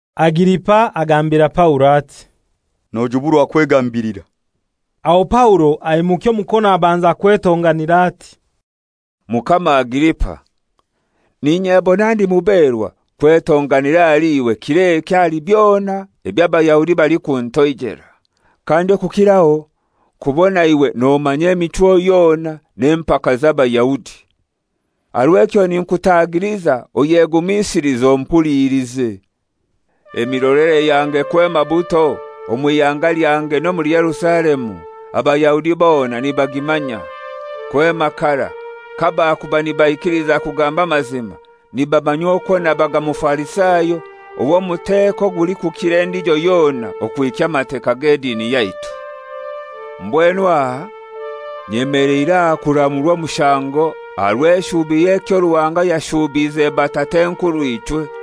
Agiripa agambira Paulo ati, «Nojuburwa kwegambilira.» Aho Paulo aimukya omukono abanza kwetonganira ati, «Mukama Agiripa, n'inyebona ndi muberwa kwetonganira ahali iwe kir'eki ahali byona eby'Abayahudi balikuntoijela, kandi okukiraho kubona iwe nomanya emichwo yona n'empaka z'Abayahudi. Aha rw'ekyo ninkutagiliza oyegumisilize ompulilize. «Emirolere yange kwema buto omw'ihanga lyange n'omuli Yerusalemu, Abayahudi bona nibagimanya. Kwema karai, kabakuba nibaikiliza kugamba amazima, nibamanya okwo nabaga Mufarisayo ow'omuteko ogulikukira endijo yona okuhikya Amateka g'edini yaitu. Mbwenu aha nyemeleire aha kuramurwa omushango aha rw'eshubi y'ekyo Ruhanga yashuubiize batat'enkurw'ichwe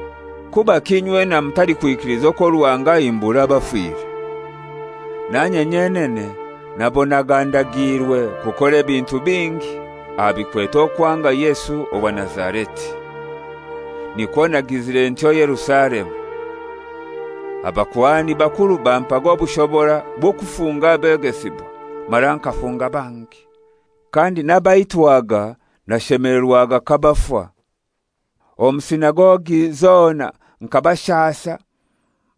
Kubaki inywena mutalikwikiliza okwo Ruhanga ahimbura abafire? «Nanye nyenene nabonaga ndagiirwe kukora ebintu bingi aha bikwete okwanga Yesu owa Nazareti. Nikwo nagizire ntyo Yerusalemu. Abakuhani bakuru bampaga obushobora bw'okufunga abegesibwa, mara nkafunga bangi; kandi n'abaitwaga nashemelerwaga kabafa. Omu sinagogi zona nkabashasa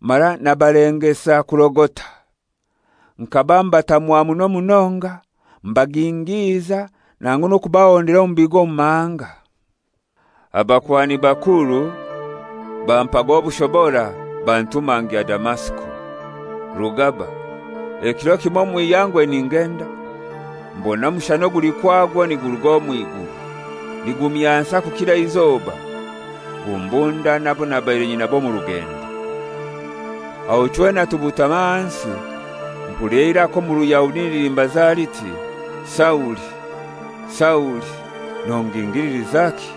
mara nabalengesa kurogota. Nkaba mbatamwa muno munonga, mbagingiiza nangu n'okubahondera omu bigo omu mahanga. «Abakuhani bakuru bampaga obushobora bantuma ngya Damasiko. Rugaba, ekiro kimoi omw'ihangwe ningenda, mbona omushana oguli kwagwo niguruga omw'iguru, nigumyansa kukira eizoba, gumbunda n'abo nabaire nyinabo omu rugendo. Aho chwena tubutama ahansi, mpulira eiraka omu Ruyahudi nilimbaza liti, ‹Sauli, Sauli, nongingililizaki?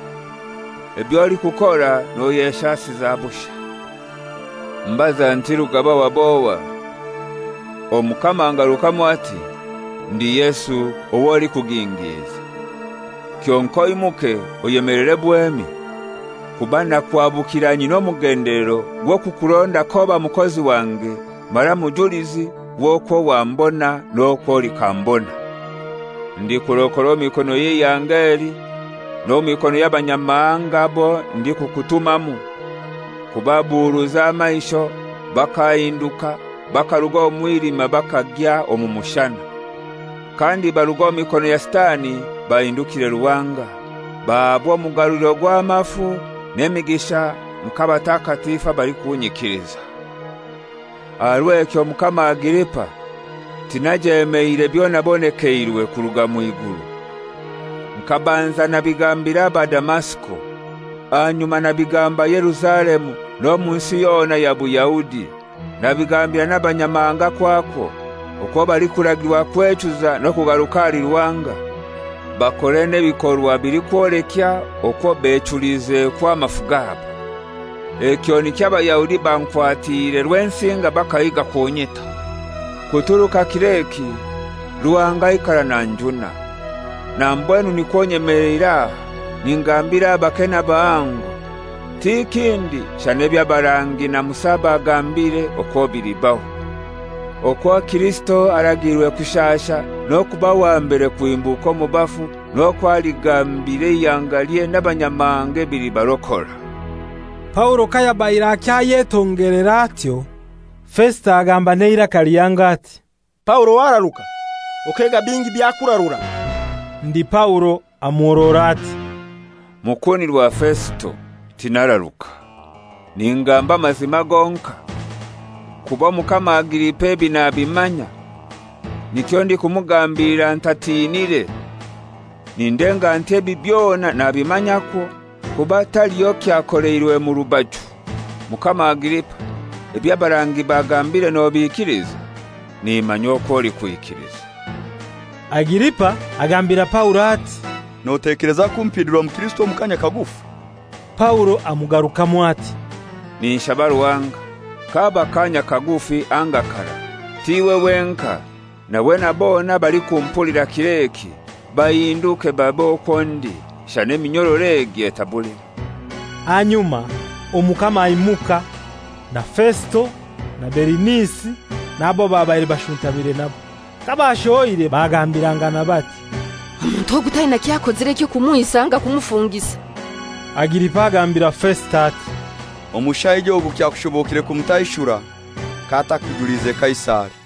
Eby'olikukora noyeshasiza busha.› Mbaza nti, ‹Rugaba wab'ohai?› Omukama angarukamu ati, ‹Ndi Yesu ow'olikugingiiza. Kyonkai oimuke oyemelere bwemi, kuba nakuhabukira nyina omugendelero gw'okukuronda k'oba mukozi wange mara mujulizi w'okwo wambona n'okwo olikambona. Ndikurokora omu mikono y'eihanga eli n'omu mikono y'Abanyamahanga abo ndikukutumamu kubabuuruza amaisho bakahinduka bakaruga omu mwilima bakagya omu mushana, kandi baruge omu mikono ya Sitani bahindukire Ruhanga, bahaabwe omugaruliro gw'amafu n'emigisha nk'abatakatifu abalikunyikiliza.› «Aha rw'ekyo, Mukama Agiripa, tinajemeire byonabonekeirwe kuruga mw'iguru. Nkabanza nabigambira aba Damasiko, ahanyuma nabigamba Yerusalemu n'omu nsi yona ya Buyahudi, nabigambira n'Abanyamahanga kwakwo, okwo balikuragirwa kwechuza n'okugaruka ahali Ruhanga, bakore n'ebikorwa bilikwolekya okwo bechulizekwo amafu gabo. Ekyo nikyo Abayahudi bankwatiire Rwensinga bakahiga kunyita. Kuturuka kir'eki Ruhanga aikara nanjuna, na mbwenu nikwo nyemeleire aha ningambira abake n'abahango, ti kindi shana eby'abarangi na Musa bagambire okwo bilibaho; okwo Kirisito aragiirwe kushasha n'okuba wa mbere kuhimbuka omu bafu, n'okwo aligambira eihangalye n'Abanyamahanga ebilibarokora.» Paulo kayabaire akyayetongelera atyo, Fesito agamba n'eiraka lihango ati, «Paulo wararuka; okega bingi byakurarura.» Ndi Paulo amuhorora ati, «Mukunirwa Fesito, tinararuka. Ningamba amazima gonkai. Kuba Omukama Agiripa ebi nabimanya, nikyo ndikumugambilira ntatiinire. Nindenga nti ebi byona nabimanyakwo, kuba taliho kyakoleirwe mu rubaju. Mukama Agiripa, eby'abarangi bagambire nobiikiliza? Nimanya okwo olikwikiliza.» Agiripa agambira Paulo ati, «Notekeleza kumpindura mukirisito omu kaanya kagufi?» Paulo amugarukamu ati, «Ninshaba Ruhanga, kaba kaanya kagufi anga karai, t'iwe wenkai, nawe na bona abalikumpulira kir'eki bahinduke babe okwo ndi, shana eminyororo egi etabulimu.» Ahanyuma omukama aimuka, na Fesito, na Berinisi, n'abo babaire bashuntamire nabo. Kabashohoire bagambirangana bati, «Omuntu ogu taina ky'akozire eky'okumwisa anga kumufungisa.» Agiripa agambira Fesito ati, «Omushaija ogu kyakushobokire kumutaishura k'atakujuliize Kaisari.»